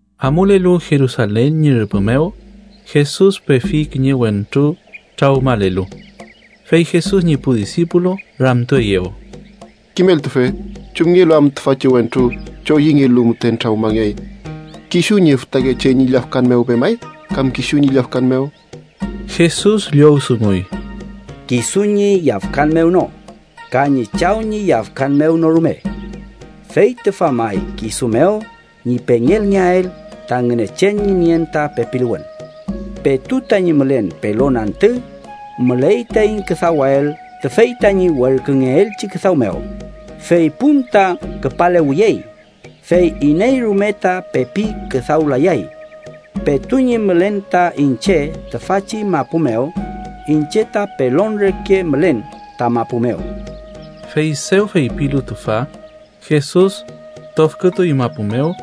Amulelu Jerusalen ñi rüpü mew, Jesus pefi kiñe wentru trawmalelu. Fey Jesus ñi pu disipulu ramtueyew: —Kimeltufe, ¿chumngelu am tüfachi wentru choyüngelu müten trawmangey? ¿Kisu ñi fütakeche ñi yafkan mew pemay kam kisu ñi yafkan mew? Jesus llowdunguy: —Kisu ñi yafkan mew no ka ñi chaw ñi yafkan mew no rume. Fey tüfa may kisu mew ñi pengelngeael ta Ngünechen ñi nien ta pepiluwün. Petu tañi mülen pelon antü, müley taiñ küdawael tüfey tañi werküngeelchi küdaw mew, fey pun ta küpalewiyey, fey iney rume ta pepi küdawlayay. Petu ñi mülen ta iñche tüfachi mapu mew, iñche ta pelon reke mülen ta mapu mew. Fey dew feypilu tüfa, Jesus tofkütuy mapu mew,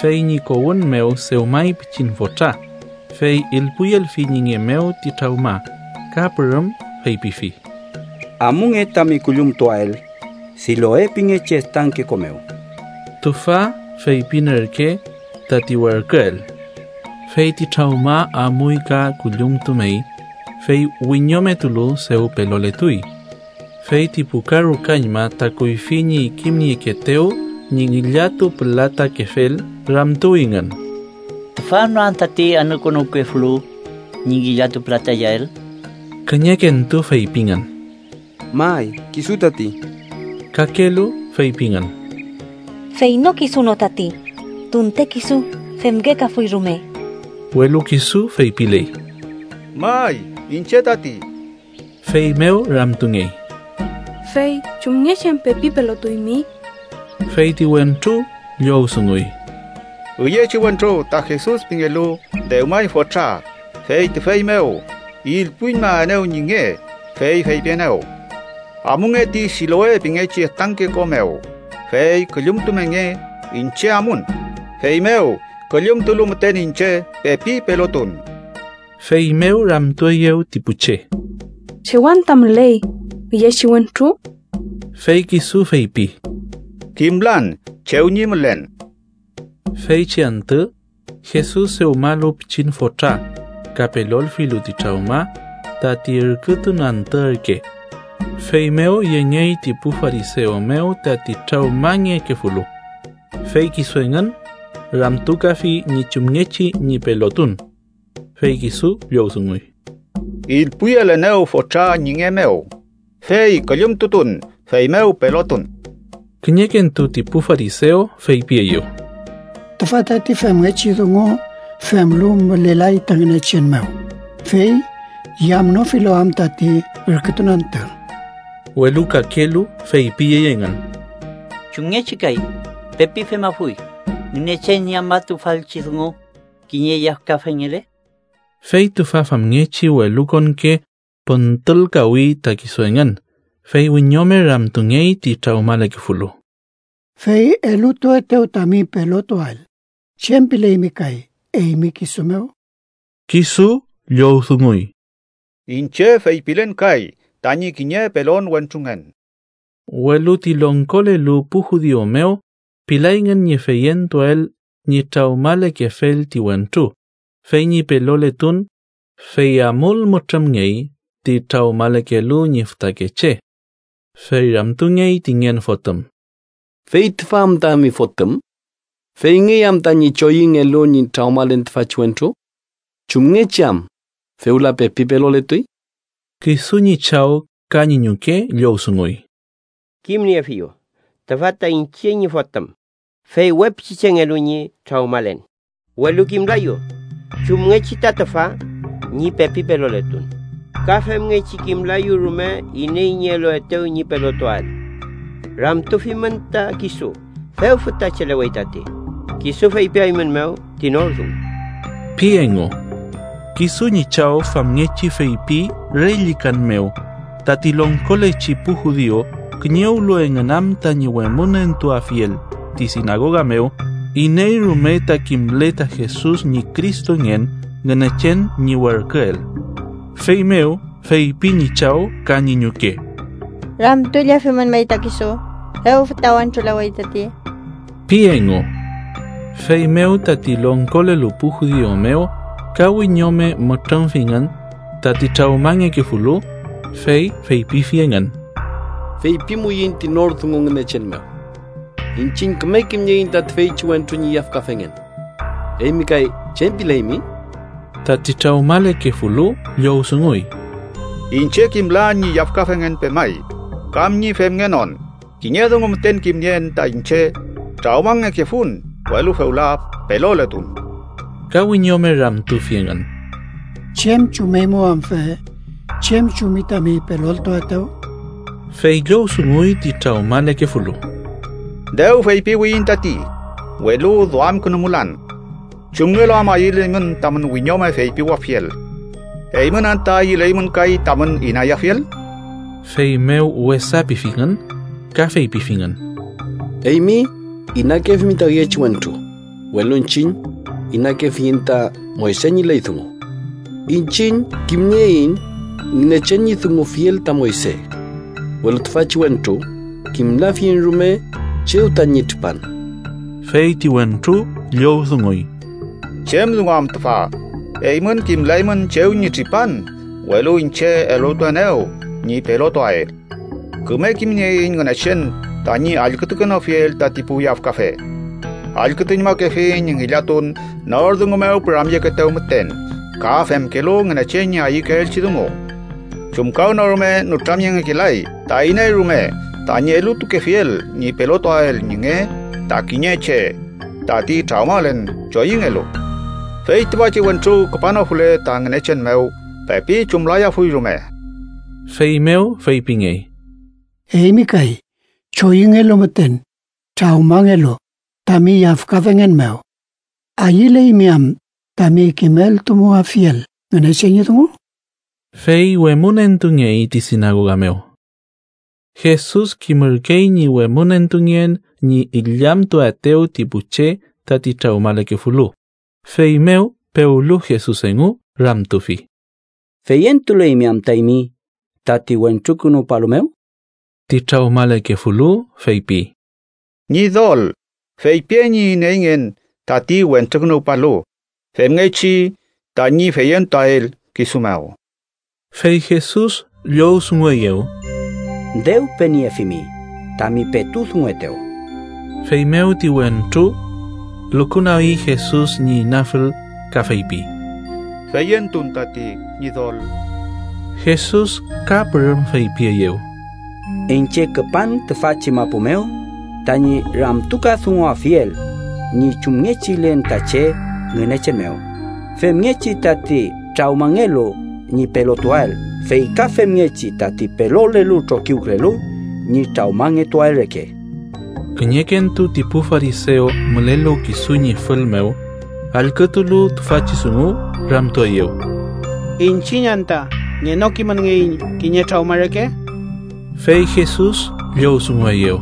fey ñi kowün mew dewmay pichin fotra, fey ilpuyelfi ñi nge mew ti trawma. Ka pürüm feypifi: —Amunge tami küllumtuael Siloe pingechi estanke ko mew (tüfa feypin ürke: “tati werküel”). Fey ti trawma amuy ka küllumtumey, fey wiñometulu, dew peloletuy. Fey ti pu karukañma ta kuyfi ñi kimniekeetew ñi ngillatupülatakefel ramtuwingün: —¿Tüfa no am tati anükünuwkefulu ñi ngillatupülatayael? Kiñekentu feypingün: —May, kisu tati. Kakelu feypingün: —Fey no, kisu no tati, tunte kisu femngekafuy rume. Welu kisu feypiley: —May, iñche tati. Feymew ramtungey: —¿Fey chumngechi am pepi pelotuymi? Fey ti wentru llowdunguy: —Üyechi wentru, ta Jesus pingelu, dewmay fotra, fey tüfey mew ilpuyüñmaenew ñi nge, fey feypienew: ‘Amunge ti Siloe pingechi estanke ko mew, fey küllumtumenge’. Iñche amun, feymew küllumtulu müten iñche, pepi pelotun. Feymew ramtueyew ti pu che: —¿Chew anta müley üyechi wentru? Fey kisu feypi: —Kimlan chew ñi mülen. Feychi antü Jesus dewmalu pichin fotra ka pelolfilu ti trawma, tati ürkütun antü ürke. Feymew yengey ti pu farisew mew tati trawmangekefulu. Fey kisu engün ramtukafi ñi chumngechi ñi pelotun. Fey kisu llowdunguy: —Ilpuyelenew fotra ñi nge mew, fey küllumtutun, feymew pelotun. Kiñekentu ti pu farisew feypieyew: —Tüfa tati femngechi dungu femlu mülelay ta Ngünechen mew, fey yamnofilu am tati ürkütun antü. Welu kakelu feypiyey engün: —¿Chumngechi kay pepi femafuy Ngünechen ñi afmatufalchi dungu, kiñe yafkafengele? Fey tüfa famngechi welukonke püntülkawi ta kisu engün. Fey wiñome ramtungey ti trawmalekefulu: —Fey elutuetew tami pelotuael, ¿chem pileymi kay eymi kisu mew? Kisu llowdunguy: —Iñche feypilen kay tañi kiñe pelon wentrungen. Welu ti longkolelu pu judiu mew pilayngün ñi feyentuael ñi trawmalekefel ti wentru, fey ñi peloletun, fey amul mütrümngey ti trawmalekelu ñi fütakeche. Fey ramtungey ti ngen fotüm: —¿Fey tüfa am tami fotüm? ¿Feyngey am tañi choyüngelu ñi trawmalen tüfachi wentru? ¿Chumngechi am fewla pepi peloletuy? Kisu ñi chaw ka ñi ñuke llowdunguy: —Kimniefiyu. Tüfa ta iñche ñi fotüm, fey we pichichengelu ñi trawmalen, welu kimlayu chumngechi ta tüfa ñi pepi peloletun, ka femngechi kimlayu rume iney ñi eluetew ñi pelotuael. Ramtufimün ta kisu, dew fütachelewey tati. Kisu feypiaeymünmew ti nor dungu ―pi engu. Kisu ñi chaw famngechi feypi re llükan mew, tati longkolechi pu judiu kiñewlu engün am tañi wemünentuafiel ti sinagoga mew iney rume ta kimle ta Jesus ñi Cristongen Ngünechen ñi werküel. Feymew feypi ñi chaw ka ñi ñuke: “Ramtullefimün may ta kisu. Dew füta wentrulewey tati” ―pi engu. Feymew tati longkolelu pu judiu mew ka wiñome mütrümfingün tati trawmangekefulu, fey feypifi engün: —Feypimuiñ ti nor dungu Ngünechen mew. Iñchiñ küme kimnieiñ ta tüfeychi wentru ñi yafkafengen. Eymi kay ¿chem pileymi? Tati trawmalekefulu llowdunguy: —Iñche kimlan ñi yafkafengen pemay kam ñi femngenon. Kiñe dungu müten kimnien ta iñche: trawmangekefun, welu fewla peloletun. Ka wiñome ramtufi engün: —¿Chem chumeymew am fe? ¿Chem chumi tami peloltuaetew? Fey llowdunguy ti trawmalekefulu: —Dew feypiwiyiñ tati, welu duamkünumulan. ¿Chumngelu am ayüleymün tamün wiñome feypiwafiel? ¿Eymün anta ayüleymün kay tamün inayafiel? Feymew wesa pifingün, ka feypifingün: —Eymi inakefimi ta üyechi wentru, welu iñchiñ inakefiyiñ ta Moyse ñi ley dungu. Iñchiñ kimnieiñ Ngünechen ñi dungufiel ta Moyse. Welu tüfachi wentru kimlafiyiñ rume chew tañi tripan. Fey ti wentru llowdunguy: —¿Chem dungu am tüfa? Eymün kimlaymün chew ñi tripan, welu iñche elutuenew ñi pelotuael. Küme kimnieiñ Ngünechen tañi allkütukenofiel tati pu yafkafe. Allkütuñmakefi ñi ngillatun nor dungu mew püramyekeetew müten ka femkelu Ngünechen ñi ayükeelchi dungu. Chumkawnorume nütramyengekelay ta iney rume tañi elutukefiel ñi pelotuael ñi nge ta kiñe che tati trawmalen choyüngelu. Fey tüfachi wentru küpanofule ta Ngünechen mew, pepi chumlayafuy rume. Feymew feypingey: —Eymi kay, choyüngelu müten trawmangelu tami yafkafengen mew, ¿ayüleymi am tami kimeltumuafiel Ngünechen ñi dungu? Fey wemünentungey ti sinagoga mew. Jesus kimürkey ñi wemünentungen ñi illamtuaetew ti pu che tati trawmalekefulu, feymew pewlu Jesus engu, ramtufi: —¿Feyentuleymi anta eymi tati Wentrukünuwpalu mew? Ti trawmalekefulu feypi: —Ñidol, feypien ñi ineyngen tati Wentrukünuwpalu, femngechi tañi feyentuael kisu mew. Fey Jesus llowdungueyew: —Dew peniefimi, tami petu dunguetew. Feymew ti wentru lukunagi Jesus ñi inafül ka feypi: —Feyentun tati, Ñidol. Jesus ka pürüm feypieyew: —Iñche küpan tüfachi mapu mew tañi ramtukadunguafiel ñi chumngechilen ta che Ngünechen mew, femngechi tati trawmangelu ñi pelotuael, fey ka femngechi tati pelolelu trokiwkülelu ñi trawmangetuael reke. Kiñekentu ti pu farisew mülelu kisu ñi fül mew, allkütulu tüfachi dungu, ramtueyew: —¿Iñchiñ anta ngenokimünngeiñ kiñe trawma reke? Fey Jesus llowdungueyew: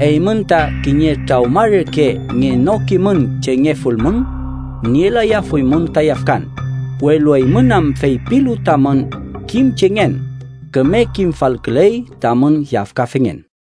—Eymün ta kiñe trawma reke ngenokimün chengefulmün, nielayafuymün ta yafkan, welu eymün am feypilu tamün kimchengen, küme kimfalküley tamün yafkafengen.